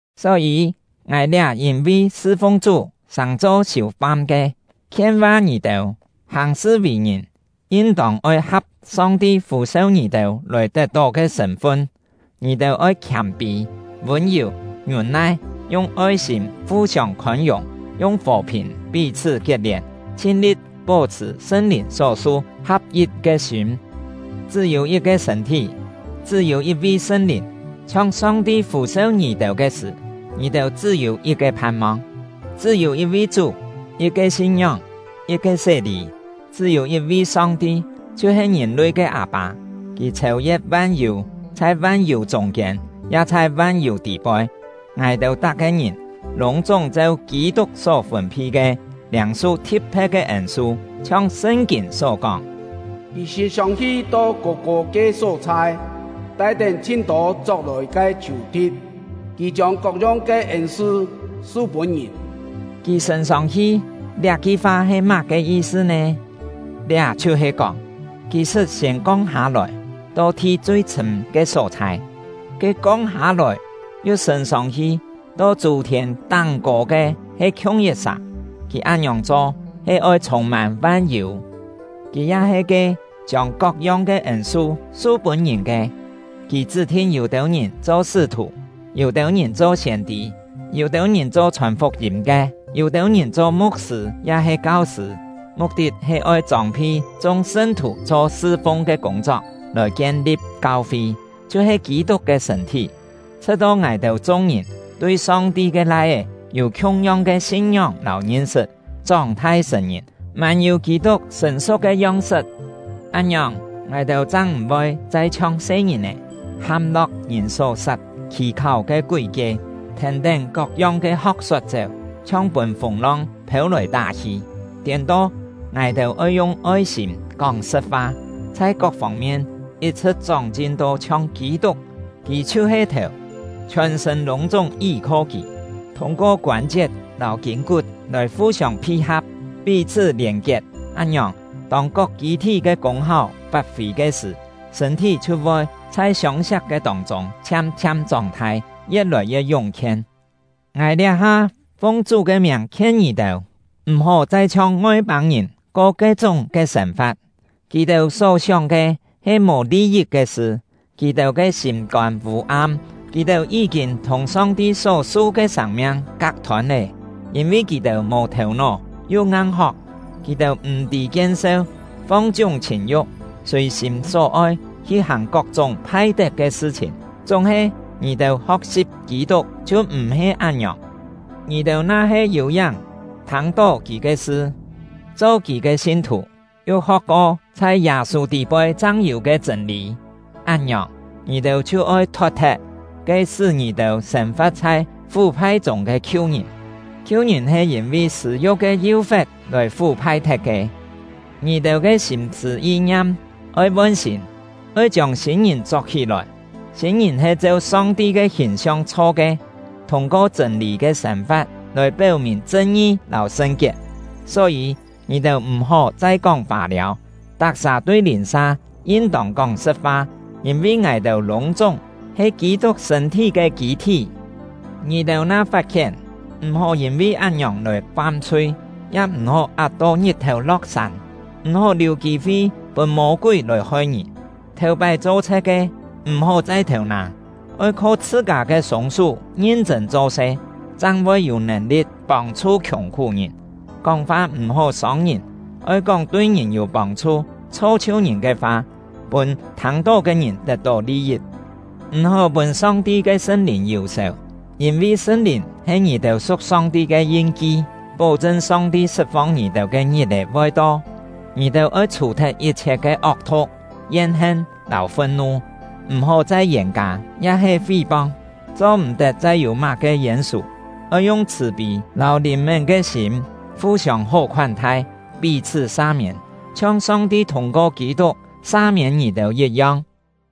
Só-yî, ngài liá yîn-vi sṳ-fung Chú sàng-cho siù-fam ke, khien-va ngì-têu: Hàng-sṳ vì-ngìn yin-tông oi ha̍p Song-ti fû-seu ngì-têu lòi tet-tó ke sṳ̂n-fun. Ngì-têu oi khiâm-pî, vûn-yù, ngiûn-nai, yung oi-sîm fu-siông khôn-yùng, yung fò-phìn pí-chhṳ́ kiet-lièn, chhin-li̍t pó-chhṳ̀ Sṳn-Lìn só-su ha̍p-yit ke sîm. Chṳ́-yû yit-ke sṳ̂n-thí, chṳ́-yû yit-vi Sṳn-Lìn; chhiong Song-ti fû-seu ngì-têu ke sṳ̀, ngì-têu chṳ́-yû yit-ke phan-mong. Chṳ́-yû yit-vi Chú, yit-ke sin-ngióng, yit-ke sé-lî. Chṳ́-yû yit-vi Song-ti, chhiu-he ngìn-lui ke Â-pâ; Kì chhêu-ye̍t van-yû, chhai van-yû chûng-kiên, ya chhai van-yû tî-poi. Ngài-têu tak-ke ngìn lûng-chúng cheu Kî-tuk só fûn-phi ke, liâng-su thi̍t-phe̍t ke ên-su. Chhiong Sṳn-kîn só kóng: Kì sṳ̂n-sông-hi to kô-kô ke só-chhai, tai-tén chhin-tô chok-lòi ke sù-thi̍t; Kì chiông kok-yong ke ên-su su-pûn ngìn. (“Kì sṳ̂n-sông-hi” liá-ki fa he má-ke yi-sṳ nè? Liá chhiu-he kóng: Kì sṳt siên kong hâ-lòi, to thi chui chhṳ̂m ke só-chhai. Ke “kong hâ-lòi” yu “sṳ̂n-sông-hi” to chû-thiên táng-kô ke he khiung yit-sà; kì án-ngiòng cho he oi chhûng-mân van-yû.) Kì ya he ke “chiông kok-yong ke ên-su su-pûn ngìn” ke; kì chṳ́-thin yû-têu ngìn cho sṳ́-thù, yû-têu ngìn cho siên-tî, yû-têu ngìn cho chhòn fuk-yîm ke, yû-têu ngìn cho mu̍k-sṳ̂ ya-he kau-sṳ̂; muk-tit he oi chông-phi chung sṳn-thù cho sṳ-fung ke kûng-chok, lòi kien-li̍p kau-fi, chhiu-he Kî-tuk ke sṳ̂n-thí, chhṳ̍t-to ngài-têu chung-ngìn tui Song-ti ke Lai-é yû khiung-yong ke sin-ngióng lâu ngin-sṳt, chóng-thai sṳ̀n-ngìn, mân-yû Kî-tuk sṳ̀n-su̍k ke yong-sṳt. Án-ngiòng, ngài-têu chang m̀-voi chai chhiong se-ngìn-è, ham-lo̍k ngìn só-sat khì-kháu ke kúi-kie, thèn-tén kok-yong ke ho̍k-sot chéu, chhiong pûn fûng-long phêu-lòi tá-hi. Tiên-to, ngài-têu oi yung oi-sîm kóng sṳ̍t-fa, chhai kok fông-mien yit-chhṳ̍t chóng-chin to chhiong Kî-tuk. Kì chhiu-he thèu; chhiòn-sṳ̂n lûng-chúng yí-kho kì, thûng-ko koân-chiet lâu kîn-kut lòi fu-siông phi-ha̍p, pí-chhṳ́ lièn-kiet. Án-ngiòng, tông kok kî-thí ke kûng-háu fat-fî ke sṳ̀, sṳ̂n-thí chhiu voi chhai siông-siak ke tông-chûng chhiam-chhiam chóng-thai, ye̍t lòi ye̍t yúng-khien. Ngài liá-ha fung Chú ke miàng khien ngì-têu: M̀-hó chai chhiong Ngoi-pâng-ngìn ko ke-chúng ke sên-fa̍t. Kì-têu só-sióng ke he mò li-yit ke sṳ, kì-têu ke sîm-kôn vû-am, kì-têu yí-kîn thùng Song-ti só-su ke sâng-miang kak-thôn lé; yîn-vi kì-têu mò thèu-nó yu ngang-hok. Kì-têu m̀-tî kien-seu, fong-chiúng chhìn-yu̍k, sùi-sîm só-oi hi hàng kok-chúng phai-tet ke sṳ-chhìn. Chúng-he, ngì-têu ho̍k-si̍p Kî-tuk chhiu m̀-he án-ngiòng! Ngì-têu na-he yû-yáng thâng-to kì ke sṳ, cho kì ke sin-thù, yu ho̍k-ko chhai Yâ-sû tî-poi chang yû ke chṳ̂n-lî, án-ngiòng, ngì-têu chhiu oi thot-thet ke sṳ́ ngì-têu sên-fa̍t chhai fú-phai chûng ke khiu-ngìn; khiu-ngìn he yîn-vi sṳ̂-yu̍k ke yú-fe̍t lòi fú-phai-thet ke. Ngì-têu ke sîm-sṳ̂ yi-ngiam oi von-sîn, oi chiông sîn-ngìn chok-hí-lòi; sîn-ngìn he cheu Song-ti ke hìn-siong chho ke, thûng-ko chṳ̂n-lî ke sên-fa̍t lòi péu-mìn chṳn-ngi lâu sṳn-kiet. Só-yî, ngì-têu m̀-hó chai kóng fâ-liâu! Tak-sà tui lìn-sa yin-tông kóng sṳ̍t-fa, yîn-vi ngài-têu lûng-chúng he Kî-tuk sṳ̂n-thí ke kî-thí. Ngì-têu na fat-khién, m̀-hó yîn-vi án-ngiòng lòi fam-chhui; ya m̀-hó at-to ngit-thèu lo̍k-sân; m̀-hó liù kî-fi pûn Mô-kúi lòi hoi ngì. Thèu-pái cho-chhe̍t ke, m̀-hó chai thêu-nâ; oi kho chhṳ-kâ ke sûng-sú ngin-chṳ̂n cho-se, chang voi yû nèn-li̍t pông-chhu khiùng-khú-ngìn. Kóng-fa m̀-hó sông ngìn, oi kóng tui ngìn yû pông-chhu, chho-chhiu ngìn ke fa, pûn thâng-tó ke ngìn tet-tó li-yit. M̀-hó pûn Song-ti ke Sṳn-Lìn yù-sèu; yîn-vi Sṳn-Lìn he ngì-têu su̍k Song-ti ke yin-ki, pó-chṳn Song-ti sṳt-fong ngì-têu ke ngit-è voi to. Ngì-têu oi chhù-thet yit-chhiet ke ok-thu̍k, yen-hen, lâu fun-nu. M̀-hó chai yên-kâ ya-he fí-pong; cho-m̀-tet chai yû má-ke yên-sù. Oi yung chhṳ̀-pî lâu lìn-mén ke sîm fu-siông hó khoán-thai, pí-chhṳ́ sa-miên, chhiong Song-ti thûng-ko Kî-tuk sa-miên ngì-têu yit-yong.